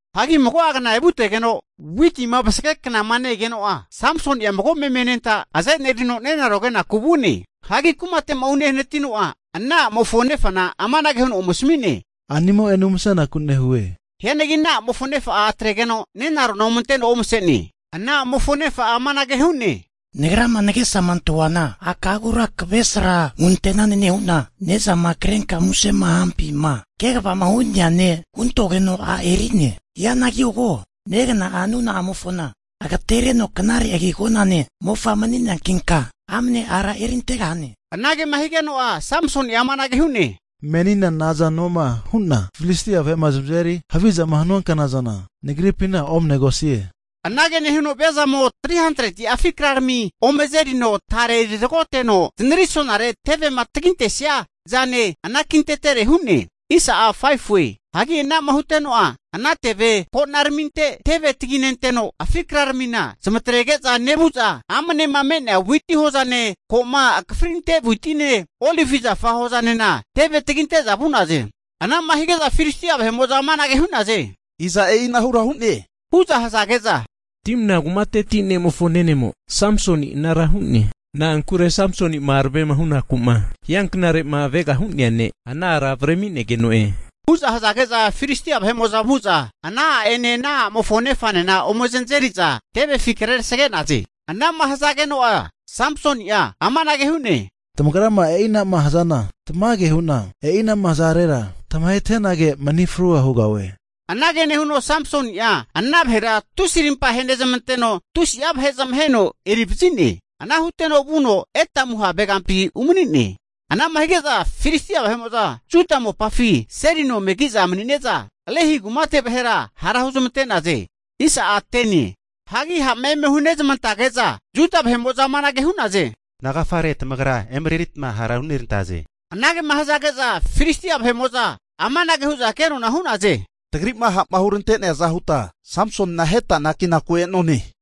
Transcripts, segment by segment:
Hagi mago'a kna evutegeno, witima vasage knama ne-egeno'a, Samsoni'a mago meme anenta azenerino nenaro kenaku vu'ne. Hagi kumate'ma unehanatino'a, ana a'mofo nefana amanage huno ome asami'ne, A'nimo'ene umasenaku nehue. Hianagi ana a'mofo nefa'a atregeno nenarona ome anteno omase'ne. Hagi ana a'mofo nefa'a amanage hu'ne, Nagrama nagesama antahuana aka'agura kavesra hunte'nane nehu'na ne'zama krenka musema hampima kavegama hu'nea ne' huntogeno, a' eri'ne. Hianagi ko, negna'a nuna'amofona agatereno knare agi agonane mofa mani'neankinka amne ara erintegahane. Anagema higeno'a Samsoni'a amanage hu'ne, Menina nazanoma hu'na Filistia vahe'ma zamazeri havizama hanua knazana nagripina omnegosie. Anage nehuno viazamo 300'a afi krarami ome azerino tare eri tragoteno zanarisonare tevema tagintesia zana anakintetere hu'ne. Hagi ana'ma huteno'a, ana teve ko'naraminte teve taginenteno afi kraramina zamatrege'za nevu'za amnema me'nea witi hozane, ko'ma akafrinte witine, olivi zafa hozanena teve taginte'za vu'naze. Ana'ma hige'za Filistia vahe'mo'za amanage hu'naze, Iza e'inara hu'ne? hu'za hazage'za, Timna kumateti ne'mofo nenemo Samsoni anara hu'ne. Na'ankure Samsoni'ma aravema hunaku'ma hianknare'ma avegama hu'nea ne' ana ara avremigeno'e. Hu'za hazage'za Filistia vahe'mo'za vu'za ana a'ene ana a'mofo nefanena ome zanazeri'za tevefi krerasage'naze. Ana'ma hazageno'a Samsoni'a amanage hu'ne, Tamagrama e'inama hazana tamage hu'na, e'ina'ma hazarera tamahetenage mani frua hugahue. Anage nehuno Samsoni'a ana vahera tusi rimpa henezmanteno tusi'a vahe zamaheno erivazi'ne. Ana huteno vuno Etamu havegampi umani'ne. Ana'ma hige'za Filistia vahe'mo'za Juda mopafi seli nona eme ki'za mani'ne'za, Lehi kumate vahera hara huzamante'naze. Hagi ha'ma eme hunezamantage'za Juda vahe'mo'za amanage hu'naze, Nagafare tamagra emereritma hara eme hunerantaze? Anagema hazage'za Filistia vahe'mo'za amanage hu'za kenona hu'naze, tagri'ma ha'ma hurante'neaza huta Samsonina aheta anakinaku e'none.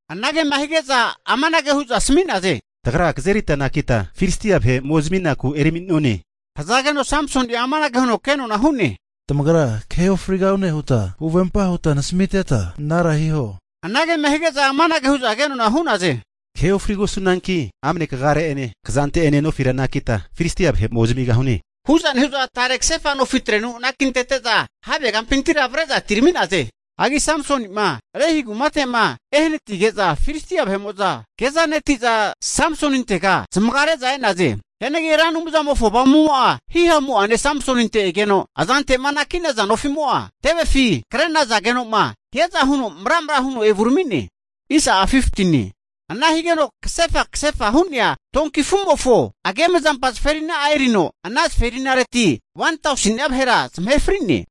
Anagema hige'za amanage hu'za asami'naze, Tagra kazerita anakita Filistia vahe ome zaminaku erami'none, hazageno Samsoni'a amanage huno kenona hu'ne, Tamagra kahe ofrigahune huta huvempa huta nasamiteta anara hiho. Anagema hige'za amanage hu'za kenona hu'naze, Kahe ofrigosunanki amne kagare'ene kazante'ene nofi anakita Filistia vahe ome zamigahune, hu'za nehu'za tare kasefa nofitrenu anakintete'za havegampintira avre'za atirami'naze. Hagi Samsoni'ma Lehi kumate'ma ehanatige'za, Filistia vahe'mo'za kezaneti'za Samsonintega zamagare'za e'naze. Hianagi Ra Anumzamofo Avamumo'a himamu'ane Samsoninte egeno, azante'ma anaki'naza nofi'mo'a tevefima kre'nazageno'ma hiaza huno mramra huno evurami'ne. Ana higeno kasefa kasefa hu'nea donki afu'mofo agemazampa zaferina'a erino ana zaferinaretira 1tauseni'a vahe zamahe fri'ne.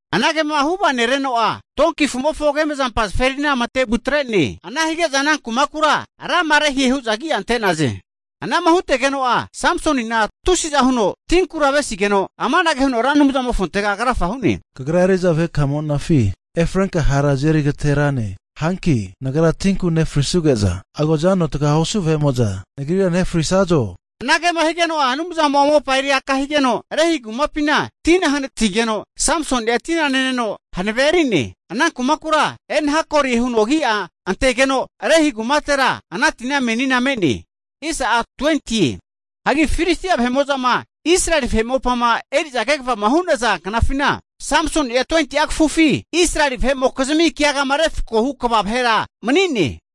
Anagema huvanereno'a, donki afu'mofo agemzampa zaferina matevu atre'ne. Ana hige'za ana kumakura Rama-lehie hu'za agi'a ante'naze. Ana'ma hutegeno'a Samsonina tusiza huno tinkura avesigeno amanage huno Ra Anumzamofontega krafa hu'ne, Kagra eri'za vahekamonafi efrenka hara azeri agaterane. Hanki nagra tinku nefrisuge'za agozano taga osu vahe'mo'za nagrira nahefrisazo? Anagema higeno'a Anumzamo'a mopa eri aka higeno, Lehi kumapina tina hanatigeno Samsoni'a tina neno hanavea eri'ne. Ana kumakura En-hakore huno agia antegeno Lehi kumatera ana tina meninena me'ne. Hagi Filistia vahe'mo'zama Israeli vahe mopama eri'za kegavama hu'naza knafina, Samsoni'a 20'a kafufi Israeli vahe'mokizmi keagama refkoma hu kva vahera mani'ne.